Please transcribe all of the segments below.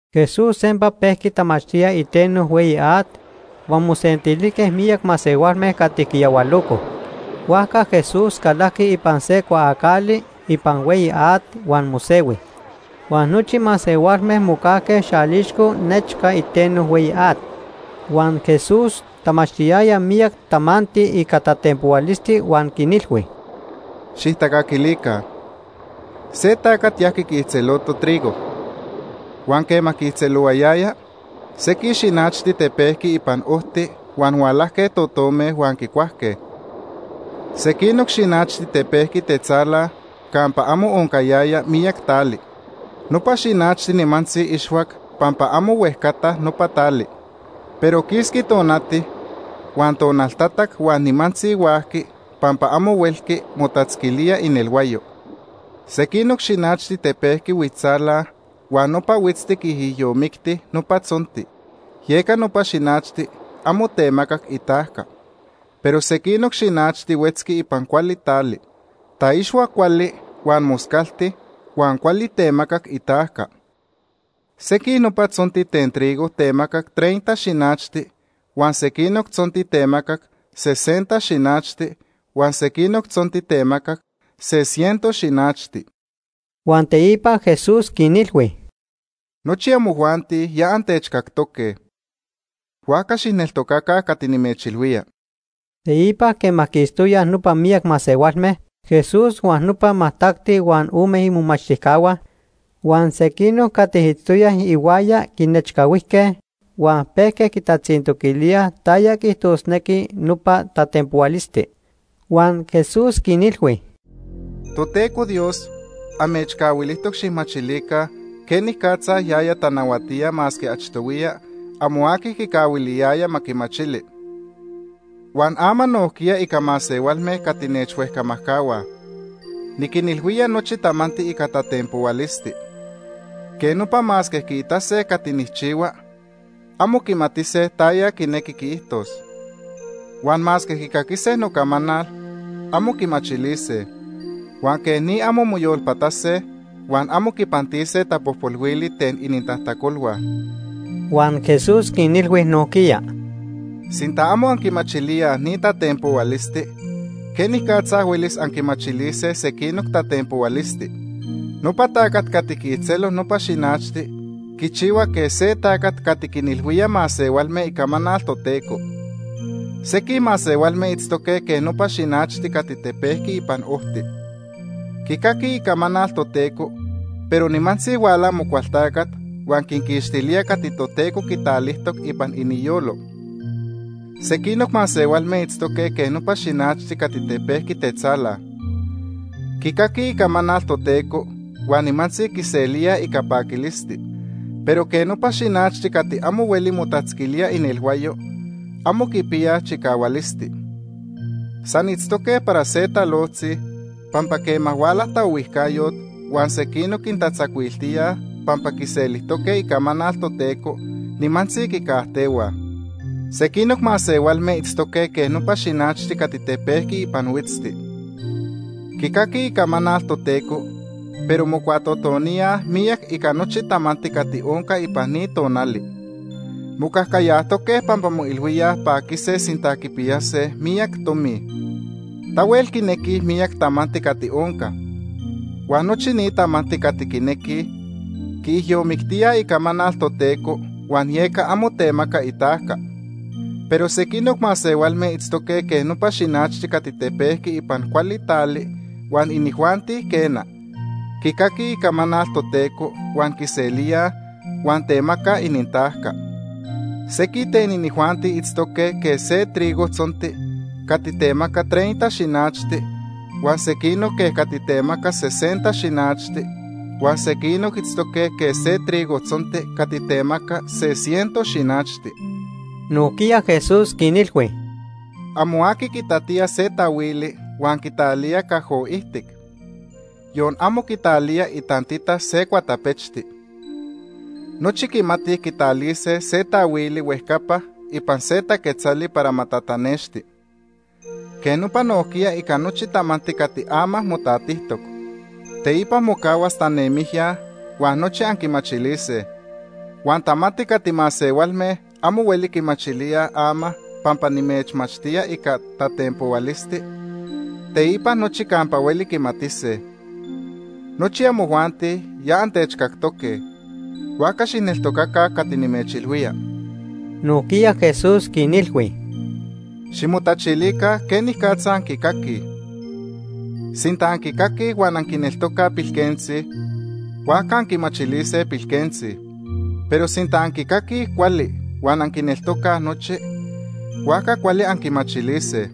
Jesús sempa pejqui tamachtía iteno hueyi at, huan mosentilijque miyac masehualme cati quiyahualocoj. Huajca Jesús calajqui ipan se cuaacali ipan hueyi at huan mosehui, huan nochi masehualme mocajque xalixco nechca iteno hueyi at. Huan Jesús tamachtiyaya miyac tamanti ica tatenpohualisti huan quinilhui: “¡Xijtacaquilica! Se tacat yajqui quiijtzeloto trigo. Huan quema quiijtzelohuayaya, sequij xinachti tepejqui ipan ojti huan hualajque totome huan quicuajque. Sequinoc xinachti tepejqui tetzala campa amo oncayaya miyac tali. Nopa xinachti nimantzi ixhuac pampa amo huejcata nopa tali. Pero quisqui tonati, huan tonaltatac huan nimantzi huajqui pampa amo huelqui motatzquilía inelhuayo. Sequinoc xinachti tepejqui huitztzala huan nopa huitzti quiijyomicti nopa tzonti, yeca nopa xinachti amo temacac itajca. Pero sequinoc xinachti huetzqui ipan cuali tali. Taixhuac cuali, huan moscalti, huan cuali temacac itajca. Sequij nopa tzonti ten trigo temacac treinta xinachti, huan sequinoc tzonti temacac sesenta xinachti, huan sequinoc tzonti temacac se ciento xinachti.” Huan teipa Jesús quinilhui: “Nochi amojuanti ya antechcactoque. Huajca xijneltocaca cati nimechilhuía.” Teipa quema quistoyaj nopa miyac masehualme, Jesús huan nopa majtacti huan ome imomachtijcahua huan sequinoc cati itztoyaj ihuaya quinechcahuijque huan pejque quitatzintoquilíaj taya quiijtosnequi nopa tatenpohualisti. Huan Jesús quinilhui: “Toteco Dios, amechcahuilijtoc xijmachilica quenicatza yaya tanahuatía masque achtohuiya amo aqui quicahuiliyaya ma quimachili. Huan ama nojquiya ica masehualme cati nechhuejcamajcahuaj, niquinilhuía nochi tamanti ica tatenpohualisti. Quej nopa masque quiitase cati nijchihua, amo quimatise taya quinequi quiijtos. Huan masque quicaquise nocamanal, amo quimachilise. Huan quej ni amo moyolpatase, huan amo quipantise tapojpolhuili ten inintajtacolhua.” Huan Jesús quinilhui nojquiya: “¿Sinta amo anquimachilíaj ni tatenpohualisti, quenicatza huelis anquimachilise sequinoc tatenpohualisti? Nopa tacat cati quiijtzelo nopa xinachti quichihua quej se tacat cati quinilhuía masehualme icamanal Toteco. Sequij masehualme itztoque quej nopa xinachti cati tepejqui ipan ojti. Quicaquij icamanal Toteco, pero nimantzi huala Amocualtacat huan quinquixtilía cati Toteco quitalijtoc ipan iniyolo. Sequinoc masehualme itztoque quej nopa xinachti cati tepejqui tetzala. Quicaquij icamanal Toteco huan nimantzi quiselíaj ica paquilisti. Pero quej nopa xinachti cati amo hueli motatzquilía inelhuayo, amo quipiyaj chicahualisti. San itztoque para se talojtzi, pampa quema huala taohuijcayot huan sequinoc quintatzacuiltíaj pampa quiselijtoque icamanal Toteco, nimantzi quicajtehuaj. Sequinoc masehualme itztoque quej nopa xinachti cati tepejqui ipan huitzti. Quicaquij icamanal Toteco, pero mocuatotoníaj miyac ica nochi tamanti cati onca ipan ni tonali. Mocajcayajtoque pampa moilhuíaj paquise sinta quipiyase miyac tomi. Tahuel quinequij miyac tamanti cati onca. Huan nochi ni tamanti cati quinequij quiijyomictíaj icamanal Toteco, huan yeca amo temaca itajca. Pero sequinoc masehualme itztoque quej nopa xinachti cati tepejqui ipan cuali tali huan inijuanti, quena, quicaquij icamanal Toteco huan quiselíaj, huan temacaj inintajca. Sequij ten inijuanti itztoque quej se trigo tzonti cati temaca treinta xinachti, huan sequinoc quej cati temaca sesenta xinachti, huan sequinoc itztoque quej se trigo tzonti cati temaca se ciento xinachti.” Nojquiya Jesús quinilhui: “Amo aqui quitatía se taahuili huan quitalía cajo ijtic, yon amo quitalía itantita se cuatapechti. Nochi quimatij quitalise se taahuili huejcapa ipan se taquetzali para ma tatanexti. Quej nopa nojquiya ica nochi tamanti cati ama motatijtoc. Teipa mocahuas tanemijya huan nochi anquimachilise. Huan tamanti cati masehualme amo hueli quimachilíaj ama pampa nimechmachtía ica tatenpohualisti, teipa nochi campa hueli quimatise. Nochi amojuanti ya antechcactoque, huajca xijneltocaca cati nimechilhuía.” Nojquiya Jesús quinilhui: “Ximotachilica quenicatza anquicaquij. Sinta anquicaquij huan anquineltocaj pilquentzi, huajca anquimachilise pilquentzi. Pero sinta anquicaquij cuali huan anquineltocaj nochi, huajca cuali anquimachilise.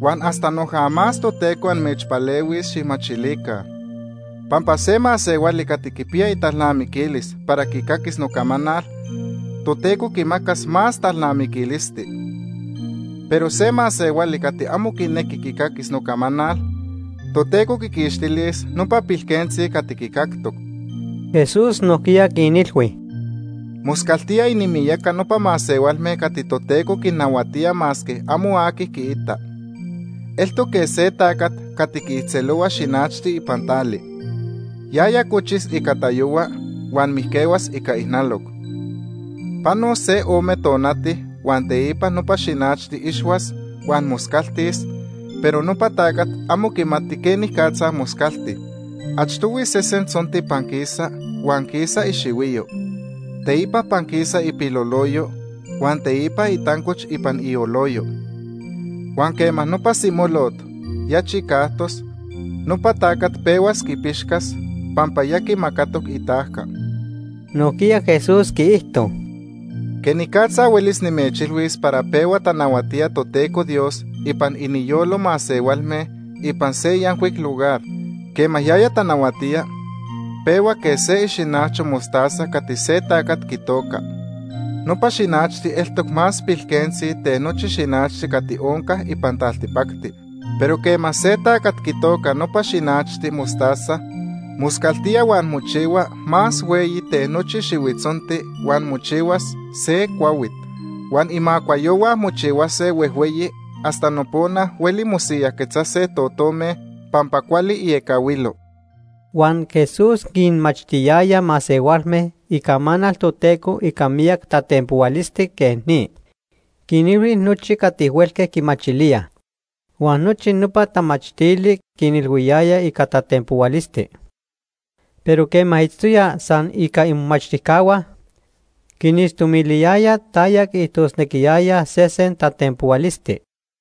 Huan hasta noja más Toteco amechpalehuis xijmachilica. Pampa se masehuali cati quipiya italnamiquilis para quicaquis nocamanal, Toteco quimacas más talnamiquilisti. Pero se masehuali cati amo quinequi quicaquis nocamanal, Toteco quiquixtilis nopa pilquentzi cati quicactoc.” Jesús nojquiya quinilhui: “Moscaltía inimiyaca nopa masehualme cati Toteco quinnahuatía masque amo aqui quiita. Eltoc quej se tacat cati quiijtzelohua xinachti ipan tali. Yaya cochis ica tayohua huan mijquehuas ica ijnaloc. Panos se ome tonati huan teipa nopa xinachti ixhuas huan moscaltis, pero nopa tacat amo quimati quenicatza moscalti. Achtohui sesen tzonti panquisa, huan quisa ixihuiyo. Teipa panquisa ipiloloyo, huan teipa itancoch ipan ioloyo. Huan quema nopa simolot ya chicajtos, nopa tacat pehuas quipixcas, pampa ya quimacatoc itajca.” Nojquiya Jesús quiijto: “¿Quenicatza huelis nimechilhuis para pehua tanahuatía Toteco Dios ipan iniyolo masehualme ipan se yancuic lugar? Quema yaya tanahuatía, pehua quej se ixinacho mostaza cati se tacat quitoca. Nopa xinachti eltoc más pilquentzi ten nochi xinachti cati onca ipan taltipacti. Pero quema se tacat quitoca nopa xinachti mostaza, moscaltía huan mochihua más hueyi ten nochi xihuitzonti huan mochihuas se cuahuit. Huan imacuayohua mochihuase huejhueyi hasta nopona hueli mosiyajquetzase totome pampa cuali iecahuilo.” Huan Jesús quinmachtiyaya masehualme icamanal Toteco ica miyac tatenpohualisti quej ni. Quinilhui nochi cati huelque quimachilíaj. Huan nochi nopa tamachtili quinilhuiyaya ica tatenpohualisti. Pero quema itztoya san ica imomachtijcahua, quinixtomiliyaya taya quiijtosnequiyaya sesen tatenpohualisti.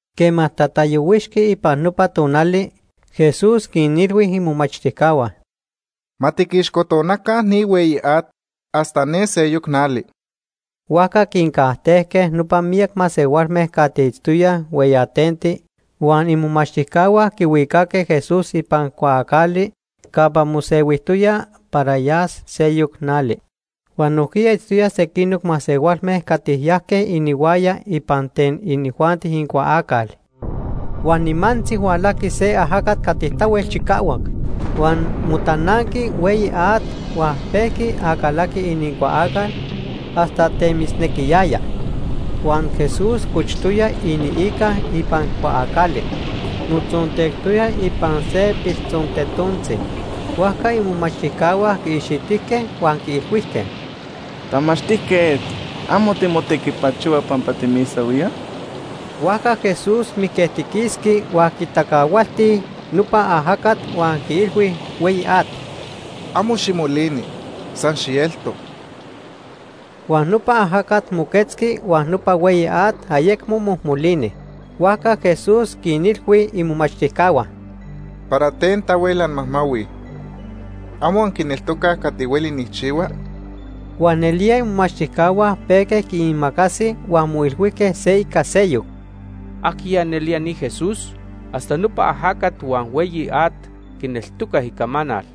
Quema tatayohuixqui ipan nopa tonali, Jesús quinilhui imomachtijcahua: ―Ma tiquixcotonaca ni hueyi at hasta ne seyoc nali. Huajca quincajtejque nopa miyac masehualme cati itztoyaj hueyatenti huan imomachtijcahua quihuicaque Jesús ipan cuaacali campa mosehuijtoya para yas seyoc nali. Huan nojquiya itztoyaj sequinoc masehualme cati yajque inihuaya ipan ten inijuanti inincuaacal. Huan nimantzi hualajqui se ajacat cati tahuel chicahuac. Huan motananqui hueyi at huan pejqui acalaqui inincuaacal hasta temisnequiyaya. Huan Jesús cochtoya iniica ipan cuaacali, motzontectoya ipan se piltzontetontzi. Huajca imomachtijcahua quiixitijque huan quiilhuijque: ―¡Tamachtijquet! ¿Amo timotequipachohua pampa timisahuíaj? Huajca Jesús mijquejtiquisqui huan quitacahualti nopa ajacat huan quiilhui hueyi at: ―Amo ximolini, san xielto. Huan nopa ajacat moquetzqui huan nopa hueyi at ayecmo mojmolini. Huajca Jesús quinilhui imomachtijcahua: ―¿Para ten tahuel anmajmahuij? ¿Amo anquineltocaj cati hueli nijchihua? Huan nelía imomachtijcahua pejque quiimacasij huan moilhuijque se ica seyoc: ―¿Ajquiya nelía ni Jesús? Hasta nopa ajacat huan hueyi at quineltocaj icamanal.